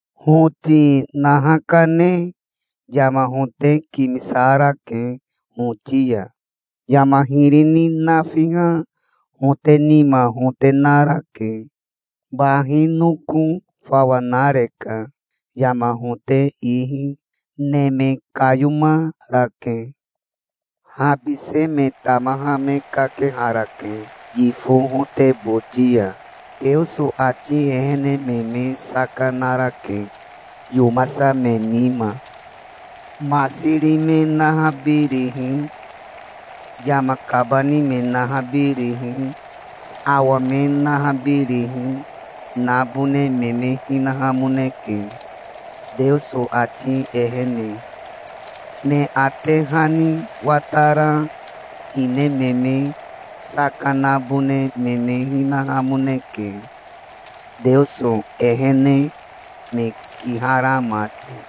Hoti naha kane yama hote kimisarake hoti ya. Yama hiri ni nafiha hote nima hote narake. Bahi noko fawa nareka, yama hote ihi. Neme kayomarake. Habise me tamaha me kakeharake yifo hote boti ya. Teoso ati ehene me me saka narake, yomasa me nima. Masiri me nahabirihi, yama kabani me nahabirihi, awa me nahabirihi, nabone me me hinahamoneke, Teoso ati ehene. Me ate hani watara hine me me saka nabone me me hinahamoneke, Teoso ehene me kihara mati.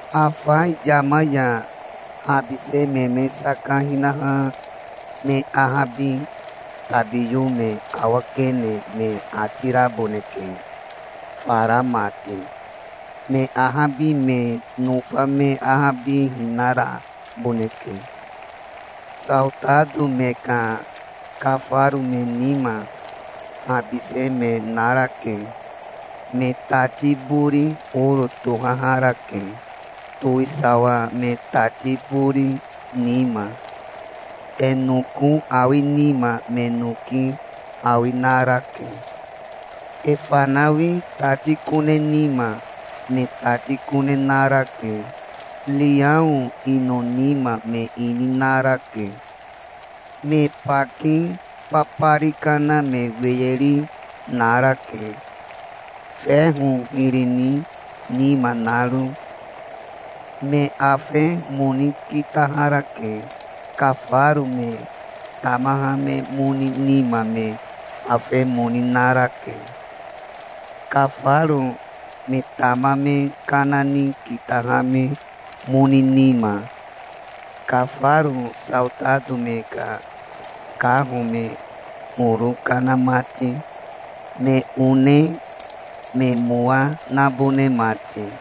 Afa yama ya habise me me saka hinaha me ahabi tabiyo me awakene me ati raboneke fara mati. Me ahabi me nofa me ahabihina raboneke. Saotato me ka kafaro me nima habise me narake. Me tati bori oro tohaharake, towisawa me tati bori nima. E noko awi nima me noki awi narake. E fanawi tati kone nima me tati kone narake. Riao ino nima me ini narake. Me baki babari kana me weyeri narake, feho hiri ni nima naro. Me afe moni kitaharake. Kafaro me tamaha me moni nima me afe moni narake, kafaro me tama me kana ni kitaha me moni nima, kafaro saotato me ka kaho me horo kana mati, me one me mowa nabone mati.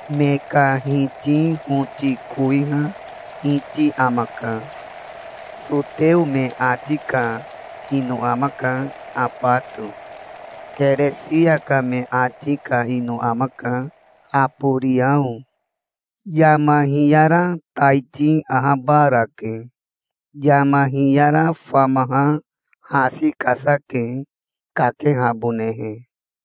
Me ka hiti hoti kowiha hiti amaka. Soteo me ati ka ino amaka Abato. Keresia ka me ati ka ino amaka Aboriao. Yama hiyara taiti ahabarake. Yama hiyara famaha hasi kasa ke, kakehabonehe.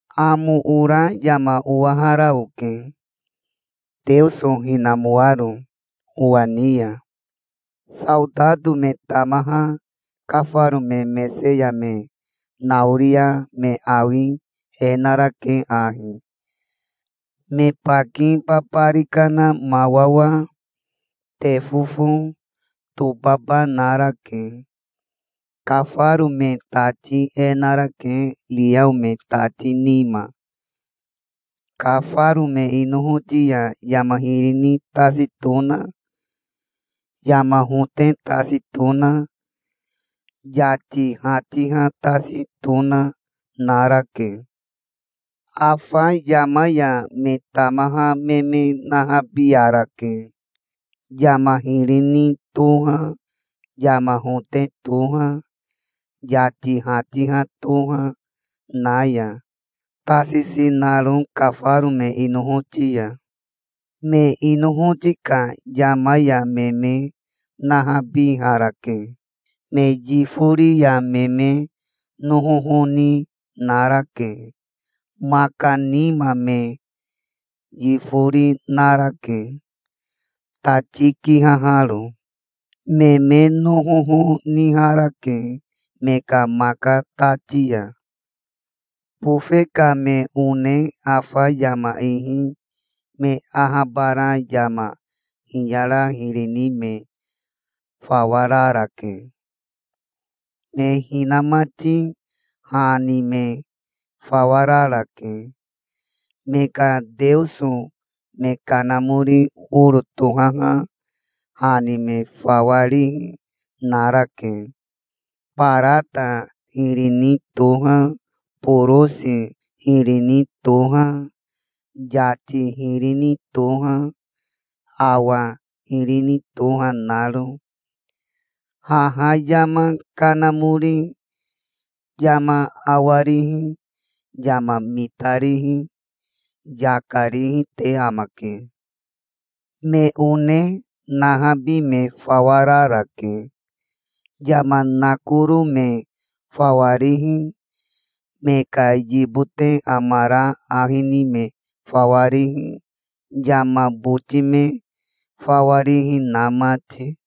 Amo ora yama owahara oke, Teoso hinamoaro owa ni ya. Saotato me tamaha kafaro me mese ya me naoria me awi e narake ahi: me baki babari kana mawawa, tefofo, tobaba narake. Kafaro me tati e narake riao me tati nima. Kafaro me inohoti ya yama hiri ni tasi tona, yama hote tasi tona, yati hatiha tasi tona, narake. Afa yama ya me tamaha me me nahabiarake, yama hiri ni toha, yama hote toha, yati hatiha toha, na ya, tasisi naro kafaro me inohoti ya. Me inohoti ka yama ya me me nahabiharake. Me yifori ya me me nohoho ni narake. Maka nima me yifori narake, tati kihaharo. Me me nohoho niharake me ka maka tati ya. Bofe ka me one afa yama ihi me ahabara yama hiyara hiri ni me fawa rarake. Me hinamati ha ni me fawa rarake. Me ka teoso me kanamori oro tohaha ha ni me fawa rihi narake, barata hiri ni toha, borosi hiri ni toha, yati hiri ni toha, awa hiri ni toha naro. Haha yama kanamori yama awarihi, yama mitarihi, yaka rihi te amake. Me one nahabi me fawa rarake, yama nakoro me fawa rihi, me ka yibote amara ahi ni me fawa rihi, yama boti me fawa rihi na mati.